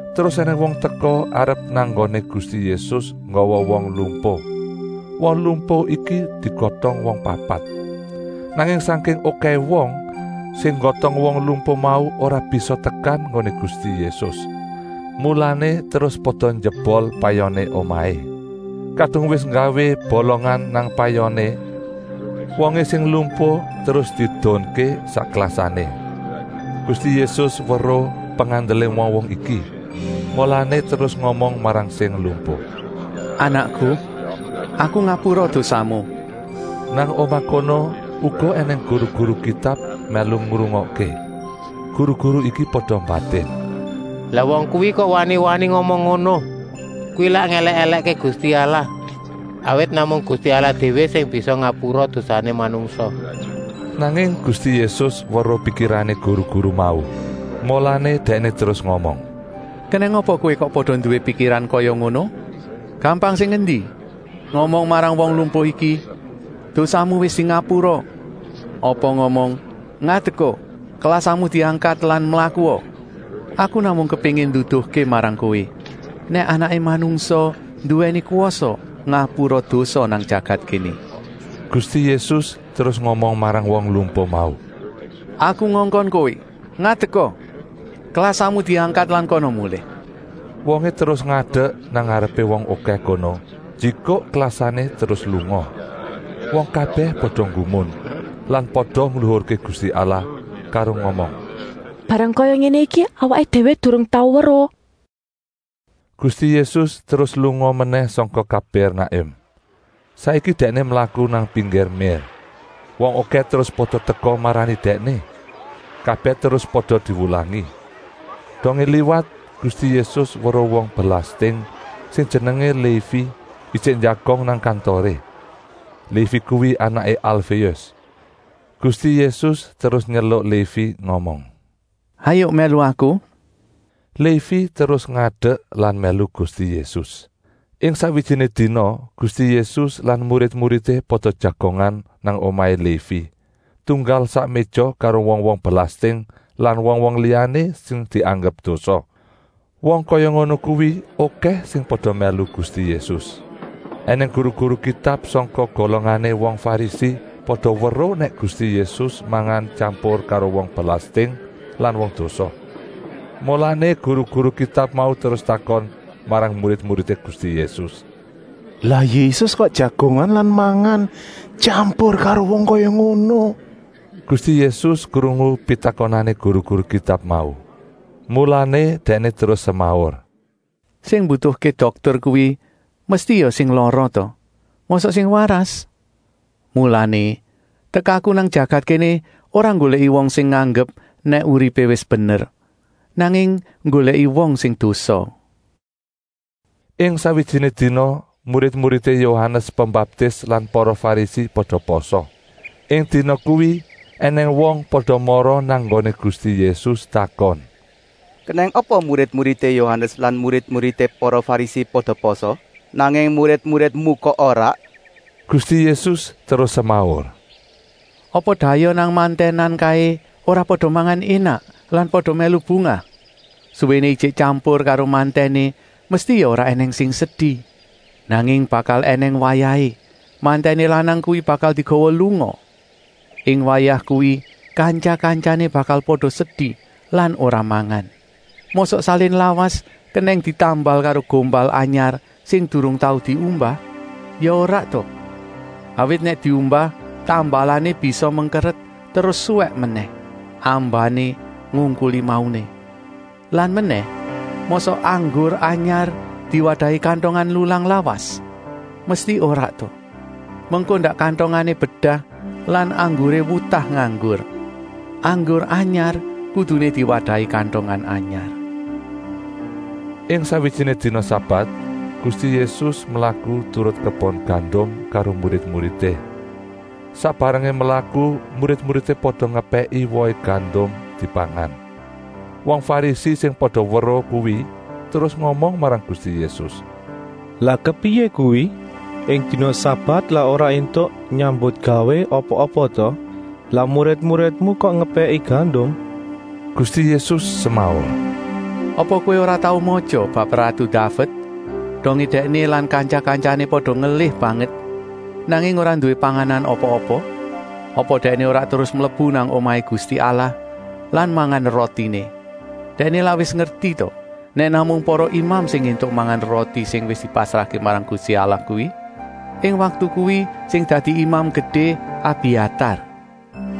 Terus ènèng wong teka arep nang nggoné Gusti Yésus nggawa wong lumpuh. Wong lumpuh iki digotong wong papat. Nanging sangking okèhé wong, sing nggotong wong lumpuh mau ora bisa tekan nggoné Gusti Yésus. Mulané terus pada njebol payoné omahé. Kadung wis nggawé bolongan nang payoné, wongé sing lumpuh terus diedunké sak klasané. Gusti Yésus weruh pengandelé wong-wong iki, mulané terus ngomong marang sing lumpuh: “Anakku, Aku ngapura dosamu!” Nang omah kono uga ènèng guru-guru Kitab mèlu ngrungokké. Guru-guru iki pada mbatin: “Lah wong kuwi kok wani-wani ngomong ngono? Kuwi lak ngèlèk-èlèkké Gusti Allah, awit namung Gusti Allah déwé sing bisa ngapura dosané manungsa!” Nanging Gusti Yésus weruh pikirané guru-guru mau, mulané Dèkné terus ngomong: “Kenèng apa kowé kok pada nduwé pikiran kaya ngono? Gampang sing endi, ngomong marang wong lumpuh iki: ‘Dosamu wis dingapura’ apa ngomong: ‘Ngadeka, klasamu diangkat lan mlakua!’ Aku namung kepéngin nduduhké marang kowé, nèk Anaké Manungsa nduwèni kwasa ngapura dosa nang jagat kéné!” Gusti Yésus terus ngomong marang wong lumpuh mau: “Aku ngongkon kowé, ngadeka, klasamu diangkat lan kana mulih!” Wongé terus ngadek nang ngarepé wong okèh kono, njikuk klasané terus lunga. Wong kabèh pada nggumun lan pada ngluhurké Gusti Allah karo ngomong: “Barang kaya ngéné iki awaké déwé durung tau weruh!” Gusti Yésus terus lunga menèh sangka Kapèrnakum. Saiki Dèkné mlaku nang pinggir mér. Wong okèh terus pada teka marani Dèkné. Kabèh terus pada diwulangi. Dongé liwat, Gusti Yésus weruh wong belasting, sing jenengé Lévi, ijik njagong nang kantoré. Lévi kuwi anaké Alféus. Gusti Yésus terus nyeluk Lévi ngomong: “Hayuk mèlu Aku!” Lévi terus ngadek lan mèlu Gusti Yésus. Ing sakwijiné dina Gusti Yésus lan murid-muridé pada jagongan nang omahé Lévi, tunggal sak méja karo wong-wong belasting lan wong-wong liyané sing dianggep dosa. Wong kaya ngono kuwi okèh sing pada mèlu Gusti Yésus. Enèng guru-guru Kitab sangka golongané wong Farisi pada weruh nèk Gusti Yésus mangan tyampur karo wong belasting lan wong dosa. Mulané guru-guru Kitab mau terus takon marang murid-muridé Gusti Yésus: “Lah Yésus kok jagongan lan mangan tyampur karo wong kaya ngono?” Gusti Yésus krungu pitakonané guru-guru Kitab mau, mulané Dèkné terus semaur: “Sing mbutuhké dokter kuwi mesti ya sing lara ta, mosok sing waras? Mulané, tekaku nang jagat kéné ora nggolèki wong sing nganggep nèk uripé wis bener, nanging nggolèki wong sing dosa.” Ing sakwijiné dina murid-muridé Yohanes Pembaptis lan para Farisi pada pasa. Ing dina kuwi ènèng wong pada mara nang nggoné Gusti Yésus takon: “Kenèng apa murid-muridé Yohanes lan murid-muridé para Farisi pada pasa, nanging murid-muridmu kok ora?” Gusti Yésus terus semaur: “Apa dayoh nang mantènan kaé ora pada mangan énak lan pada mèlu bungah. Suwéné ijik tyampur karo mantèné mesti ya ora ènèng sing sedi. Nanging bakal ènèng wayahé mantèné lanang kuwi bakal digawa lunga. Ing wayah kuwi kantya-kantyané bakal pada sedi lan ora mangan.” Mosok salin lawas kenèng ditambal karo gombal anyar sing durung tau diumbah? Ya ora ta. Awit nèk diumbah tambalané bisa mengkeret terus suwèk menèh, ambané ngungkuli mauné. Lan menèh, mosok anggur anyar diwadahi kantongan lulang lawas? Mesti ora ta! Mengko ndak kantongané bedah lan angguré wutah nganggur. Anggur anyar kuduné diwadahi kantongan anyar. Ing sakwijiné dina sabat Gusti Yésus mlaku turut kebon gandum karo murid-muridé. Sak barengé mlaku murid-muridé pada ngepèki wohé gandum dipangan. Wong Farisi sing pada weruh kuwi terus ngomong marang Gusti Yésus: “Lah kepriyé kuwi? Ing dina sabat lak ora éntuk nyambutgawé apa-apa ta? Lah murid-muridmu kok ngepèki gandum?” Gusti Yésus semaur: “Apa kowé ora tau matya bab ratu Daved, dongé dèkné lan kantya-kantyané pada ngelih banget, nanging ora nduwé panganan apa-apa? Apa dèkné ora terus mlebu nang omahé Gusti Allah lan mangan rotiné. Dèkné lak wis ngerti ta nèk namung para imam sing éntuk mangan roti sing wis dipasrahké marang Gusti Allah kuwi. Ing waktu kuwi sing dadi Imam Gedé Abiatar.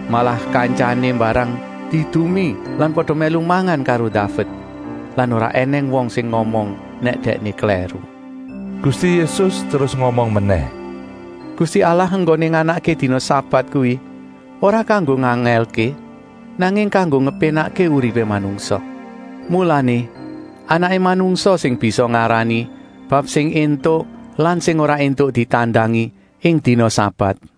Malah kantyané mbarang diedumi lan pada mèlu mangan karo Daved. Lan ora ènèng wong sing ngomong nèk dèkné klèru.” Gusti Yésus terus ngomong menèh: “Gusti Allah enggoné nganakké dina sabat kuwi ora kanggo ngangèlké, nanging kanggo ngepénakké uripé manungsa. Mulané, Anaké Manungsa sing bisa ngarani bab sing éntuk lan sing ora éntuk ditandangi ing dina sabat.”